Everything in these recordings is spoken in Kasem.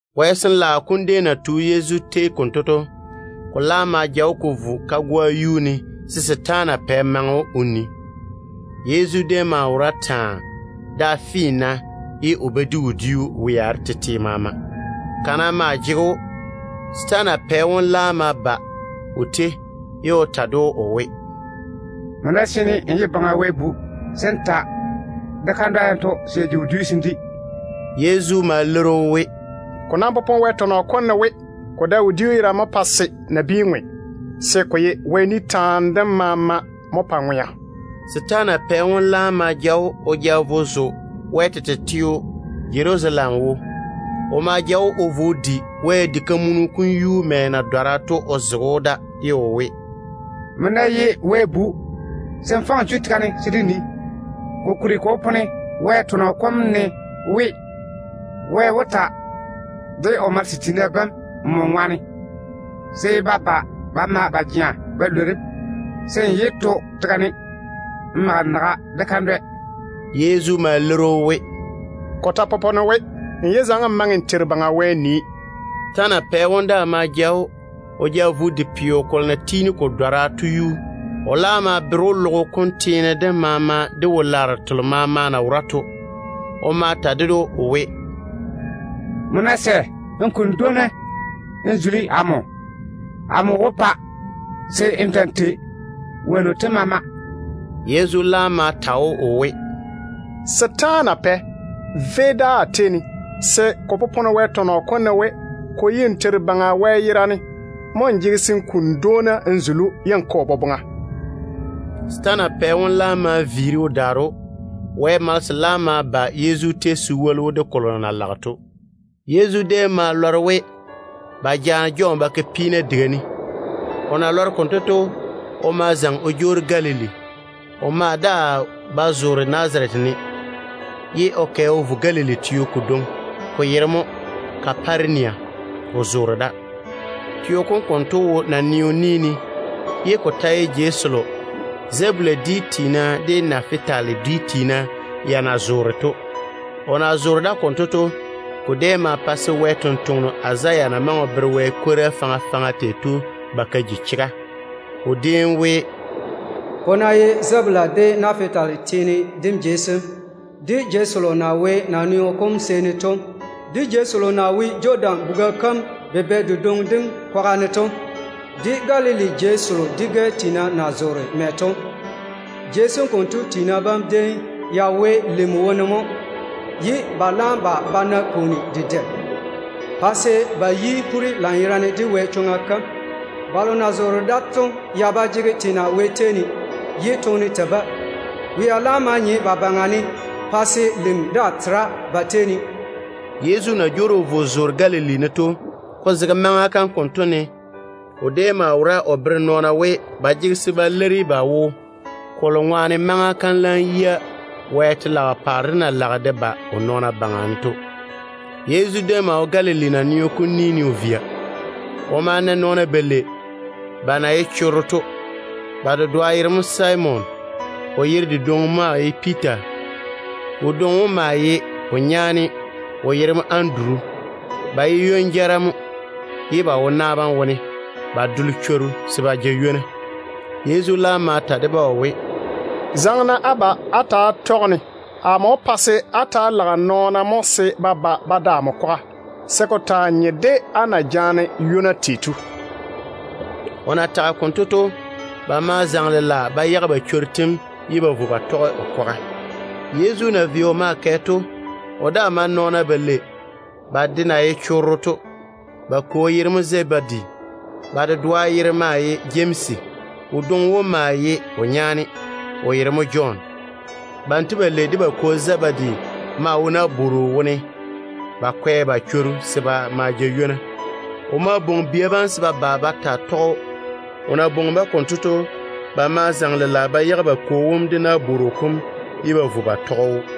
Wɛ Sin-laao kom déem na tu Yezu tei konto to, ko laam ma ja‑o ko vo kagoa yuu ne se setaana pɛ maŋe‑o o nii. Yezu déem maa wora taa, da finna, ye o ba di wodiu wea de tete maama. Kana maa jege‑o. Setaana pɛ wom laam ma ba o tei, ye o ta ded‑o o we, “Nmo ná seene n ye Baŋa Wɛ Bu, se n ta de kandwa yanto se ya ji wodiu se n di.” Yezu ma leiri‑o we, “Ko nam popone Wɛ tɔnɔ kom ne we: ‘Ko dae wodiu yerane mo pae se nabiina ŋwe, se ko ye Wɛ ni taane dem maama mo pae nɔɔna ŋwea.’” Setaana pɛ wom laam ma kwei‑o o ja vo Wɛ tete teo Jerusalem. O ma ja‑o o vo o di Wɛ diga kam yuu mɛ na dɔra to o zege‑o da, ye o we, “Nmo ná ye Wɛ Bu, se n faŋe n chu tega ne se dé nii. Kokuri, ko popone Wɛ tɔnɔ kom ne we: ‘Wɛ wó ta de o malese sem se ba ba ba ma ba jea ba lwori‑m, se n yé mage n naga de kandwɛ n to tega ne.’” Yezu ma leiri‑o we, “Ko ta popone we, ‘N yé faŋe n Teiru Baŋa Wɛ n nii.’” Setaana pɛ wom daa ma ja‑o o ja vo o di peo kolo na tiini ko dɔra to yuu. O laam ma bere‑o logo kom teene dem maama de wo-laaro telo maama na wora to. O ma ta ded‑o o we, “Nmo ná sɛ n kuni dwoona n zuli amo, amo wó pa se n ta‑n tei wonnu tem maama.” Yezu laam ma ta‑o o we, “Setaana pɛ, véi dáa a tei ne! Se ko popone Wɛ tɔnɔ kom ne we: ‘Ko ye n Teiru Baŋa Wɛ yerane mo n jege se n kuni dwoona n zuli, ye n toŋe n tɔge o boboŋa.’” Setaana pɛ wom laam ma viiri o daare‑o. Wɛ malese laam ma ba Yezu tei se woli‑o de kolo o na lage to. Yezu déem ma maane we, ba jaane Jɔn ba ke peena diga ne. O na lɔre konto to, o ma zaŋe o jwoori Galili. O maa daa ba zoore Nazarete ne, ye o kɛ o vo Galili teo kodwoŋi, ko yere mo Kaparenia, o zoore da. Teo kom konto wo naneo ni ne, jei selo Zebula dwi tiina de Nafitali dwi tiina ya na zoore da to mo. O na zoore da konto to, ko déem ma pa se Wɛ sampwora Izaya na maŋe o bere Wɛ kwora kalo faŋa faŋa tei to ba ka ji chega. O déem we: “Ko ná ye Zebula de Nafitali teene dem jei sem, de jei selo na wo naneo kom seeni to, de jei selo na wo Jɔdan buga kam bubɛ dedwoŋi dem kwaga ne to, de Galili jei selo dwi-gɛ tiina na zoore da to, jei sem konto tiina bam déem ya wo lim wone mo, ye ba laam ba ba na pwooni dedɛ, pa se ba yi poore lanyerane de Wɛ chega kam. Balo na zoore da to ya ba jege teena Wɛ tei ne. Toone mo tei-ba. Wea laam ma nye ba baŋa ne pa se lim daa tera ba tei ne.” Yezu na jwoori o vo o zoore Galili ne to, ko zege maŋa kam konto ne o déem wora o bere nɔɔna we ba jege se ba leiri ba wo, kolo ŋwaane maŋa kam laam yia Wɛ telaao paare dem na lage de ba o nɔɔna baŋa ne to. Yezu déem maa wo Galili naneo kom ni ne o via. O ma na nɔɔna balei, ba na ye chorro to. Ba dedoa yere mo Simon, o yere dedwoŋi maa ye Piita. Wodwoŋi wom maa ye o nyaane, o yere mo Anduru. Ba ye ywon-jara mo, ye ba wo na bam wone ba dole chworu ba ma jaane ywona. Yezu laam ma ta de-ba o we, “Zaŋe-na á ba á ta‑á tɔge-ne. Amo wó pa se á ta‑á lage nɔɔna mo se ba ba ba da amo kwaga, se ko taa nye de á na jaane ywona tei to.” O na tage konto to, ba ma zaŋe lela ba yage ba chworu tem ye ba vo ba tɔge o kwaga. Yezu na vei o maa kɛ to, o daa ma na nɔɔna balei, ba de ta ye chorro mo. Ba kwo yere mo Zebedi. Ba dedoa yere mo Jemsi. Wodwoŋi wom maa ye o nyaane, o yere mo Jɔn. Banto balei de ba kwo Zebedi maa wo nabworo wone ba kwɛ ba chworu se ba ma ja ywona. O ma bwoŋi bia bam se ba ba ba taa tɔge‑o. O na bwoŋi-ba konto to, ba ma zaŋe lela ba yage ba kwo wom de nabworo kom ye ba daare ba vo ba tɔge‑o.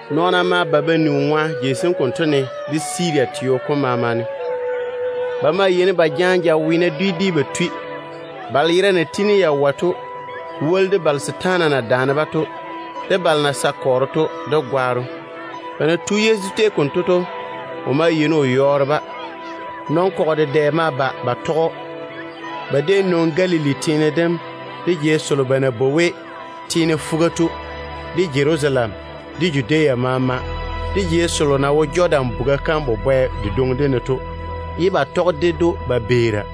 Nɔɔna ma ba ba ni o ŋwa jei sem konto ne de Siria teo kom maama ne. Ba maa yeini ba jaane jaweena dwi dwi ba tui, balo yera na tiini ya wɔe to, ko woli de balo setaana na daane-ba to, de balo na sae kɔɔro to, de gwaaro. Ba na tu Yezu tei konto to, o maa yeini o yɔɔre-ba. Nɔn-kɔgɔ dedɛ ma ba ba tɔge‑o. Ba déem nwoŋi Galili teene dem, de jei selo ba na bwoi we ‘Teene Fuga’ to, de Jerusalem, de Judea maama, de jei selo na wo Jɔdan buga kam bubɛ dedwoŋi dem ne to, ye ba tɔge ded‑o ba beera.